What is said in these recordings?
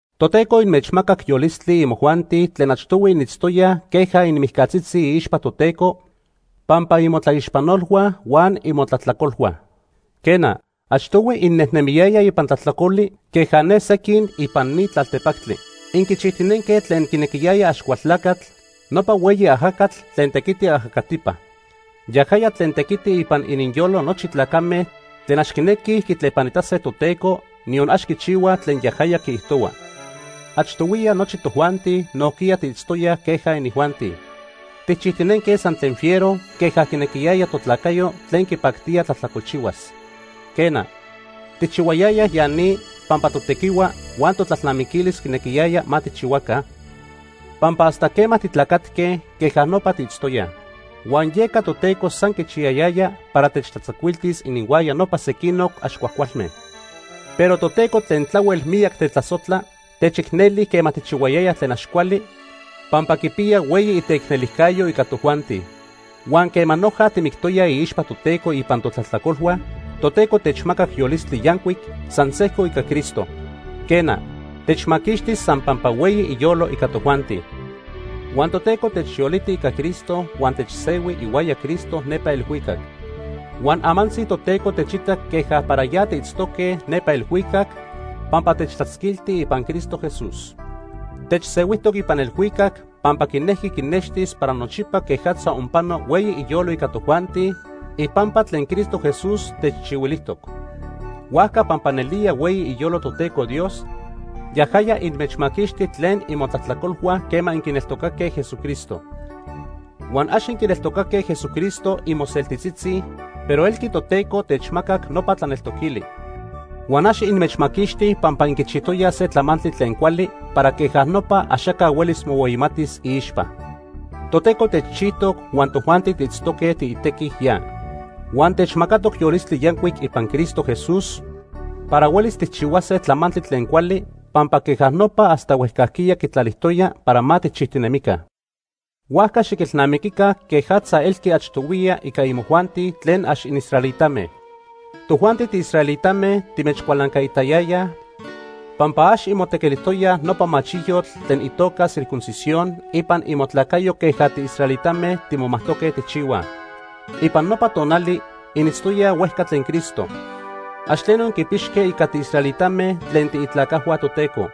Toteco inmechmacac yolistli imojuanti tlen achtohui initztoyaj queja inmijcatzitzi iixpa Toteco pampa imotlaixpanolhua huan imotlajtlacolhua. Quena, achtohui innejnemiyayaj ipan tlajtlacoli queja ne sequin ipan ni tlaltepactli. Inquichijtinenque tlen quinequiyaya Axcualtlacatl, nopa hueyi ajacatl tlen tequiti ajacatipa. Yajaya tlen tequiti ipan ininyolo nochi tlacame tlen ax quinequij quitlepanitase Toteco, niyon ax quichihuaj tlen yajaya quiijtohua. Achtohuiya nochi tojuanti nojquiya tiitztoyaj queja inijuanti. Tijchijtinenque san tlen fiero queja quinequiyaya totlacayo tlen quipactía tlajtlacolchihuas. Quena, tijchihuayayaj ya ni pampa totequihua huan totlalnamiquilis quinequiyaya ma tijchihuaca, pampa hasta quema titlacatque, queja nopa tiitztoyaj. Huan yeca Toteco san quichiyayaya para techtlatzacuiltis ininhuaya nopa sequinoc ax cuajcualme. Pero Toteco tlen tlahuel miyac tetlasojtla, techicneli quema tijchihuayayaj tlen ax cuali pampa quipiya hueyi iteicnelijcayo ica tojuanti. Huan quema noja timictoyaj iixpa Toteco ipan totlajtlacolhua, Toteco techmacac yolistli yancuic san sejco ica Cristo. Quena, techmaquixti san pampa hueyi iyolo ica tojuanti. Huan Toteco techyoliti ica Cristo huan techsehui ihuaya Cristo nepa elhuicac. Huan amantzi Toteco techita queja para ya tiitztoque nepa elhuicac pampa techtlatzquilti ipan Cristo Jesús. Techsehuijtoc ipan elhuicac pampa quinejqui quinextis para nochipa quejatza onpano hueyi iyolo ica tojuanti ipampa tlen Cristo Jesús techchihuilijtoc. Huajca pampa nelía hueyi iyolo Toteco Dios, yajaya inmechmaquixti tlen imotlajtlacolhua quema inquineltocaque Jesucristo. Huan ax inquineltocaque Jesucristo imoseltitzitzi, pero elqui Toteco techmacac nopa tlaneltoquili. Huan ax inmechmaquixti pampa inquichijtoyaj se tlamantli tlen cuali para queja nopa axaca huelis mohueyimatis iixpa. Toteco techchijtoc huan tojuanti tiitztoque tiitequi ya. Huan techmacatoc yolistli yancuic ipan Cristo Jesús para huelis tijchihuase tlamantli tlen cuali pampa queja nopa hasta huejcajquiya quitlalijtoya para ma tijchijtinemica. Huajca xiquilnamiquica quejatza elqui achtohuiya ica imojuanti tlen ax inisraelitame. Tojuanti tiisraelitame timechcualancaitayayaj pampa ax inmotequilijtoyaj nopa machiyotl tlen itoca circuncisión ipan imotlacayo queja tiisraelitame timomajtoque tijchihuaj. Ipan nopa tonali initztoyaj huejca tlen Cristo. Ax tleno inquipixque ica tiisraelitame tlen tiitlacajhua Toteco.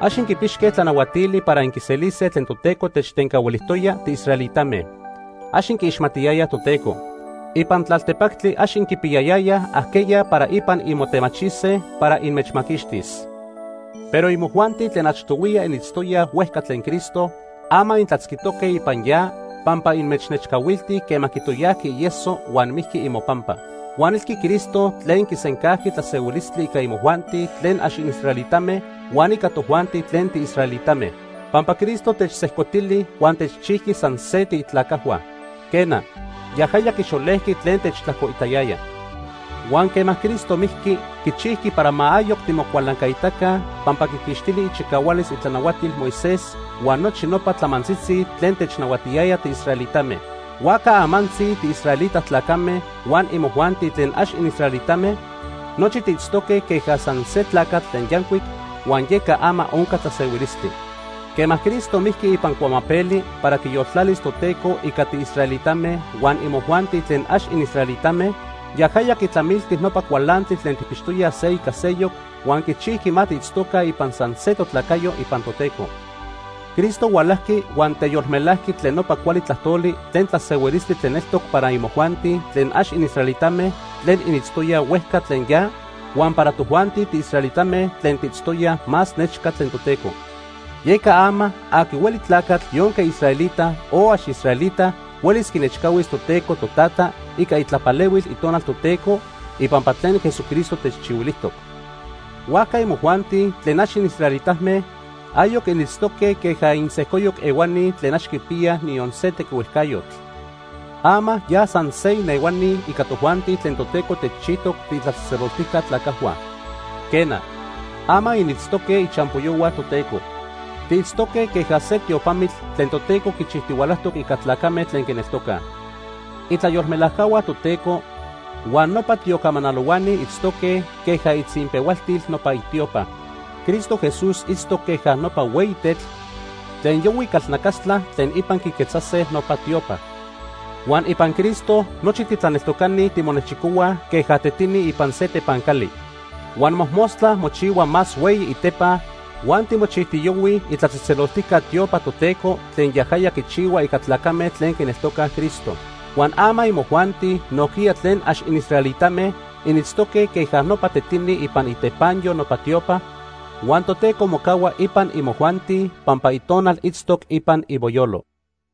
Ax inquipixque tlanahuatili para inquiselise tlen Toteco techtencahuilijtoya tiisraelitame. Ax inquiixmatiyayaj Toteco. Ipan tlaltepactli ax inquipiyayayaj ajqueya para ipan inmotemachise para inmechmaquixtis. Pero imojuanti tlen achtohuiya initztoyaj huejca tlen Cristo, ama intlatzquijtoque ipan ya pampa inmechnechcahuilti quema quitoyajqui ieso huan mijqui imopampa. Huan elqui Cristo tlen quisencajqui tlasehuilistli ica imojuanti tlen ax inisraelitame huan ica tojuanti tlen tiisraelitame, pampa Cristo techsejcotili huan techchijqui san se tiitlacajhua. Quena, yajaya quixolejqui tlen techtlajcoitayaya. Huan quema Cristo mijqui, quichijqui para ma ayoc timocualancaitaca, pampa quiquixtili ichicahualis itlanahuatil Moisés huan nochi nopa tlamantzitzi tlen technahuatiyaya tiisraelitame. Huajca amantzi tiisraelita tlacame huan imojuanti tlen ax inisraelitame, nochi tiitztoque queja san se tlacatl tlen yancuic, huan yeca ama onca tlasehuilistli. Quema Cristo mijqui ipan cuamapeli para quiyoltlalis Toteco ica tiisraelitame huan imojuanti tlen ax inisraelitame, yajaya quitlamilti nopa cualantli tlen tijpixtoyaj se ica seyoc huan quichijqui ma tiitztoca ipan san se totlacayo ipan Toteco. Cristo hualajqui huan teyolmelajqui tlen nopa cuali tlajtoli tlen tlasehuilistli tlen eltoc para imojuanti tlen ax inisraelitame tlen initztoyaj huejca tlen ya huan para tojuanti tiisraelitame tlen tiitztoyaj más nechca tlen Toteco. Yeca ama, aqui hueli tlacatl yonque israelita o ax israelita huelis quinechcahuis Toteco Totata ica itlapalehuil Itonal Toteco ipampa tlen Jesucristo techchihuilijtoc. Huajca imojuanti tlen ax inisraelitame ayoc initztoque queja insejcoyoc ehuanij tlen ax quipiyaj niyon se tequihuejcayotl. Ama ya san se inehuani ica tojuanti tlen Toteco techchijtoc tiitlatzejtzeloltijca tlacajhua. Quena, ama initztoque ichampoyohua Toteco. Tiitztoque queja se tiopamitl tlen Toteco quichijtihualajtoc ica tlacame tlen quineltocaj. Itlayolmelajcahua Toteco huan nopa tiocamanalohuani itztoque queja itzinpehualtil nopa itiopa. Cristo Jesús itztoc queja nopa hueyi tetl tlen yohui calnacastla tlen ipan quiquetzase nopa tiopa. Huan ipan Cristo nochi titlaneltocani timonechicohuaj queja tetini ipan se tepancali. Huan mojmostla mochihua más hueyi itepa huan timochijtiyohuij itlatzejtzeloltijca tiopa Toteco tlen yajaya quichihua ica tlacame tlen quineltocaj Cristo. Huan ama imojuanti nojquiya tlen ax inisraelitame initztoque queja nopa tetini ipan itepanyo nopa tiopa, huan Toteco mocahua ipan imojuanti pampa Itonal itztoc ipan imoyolo.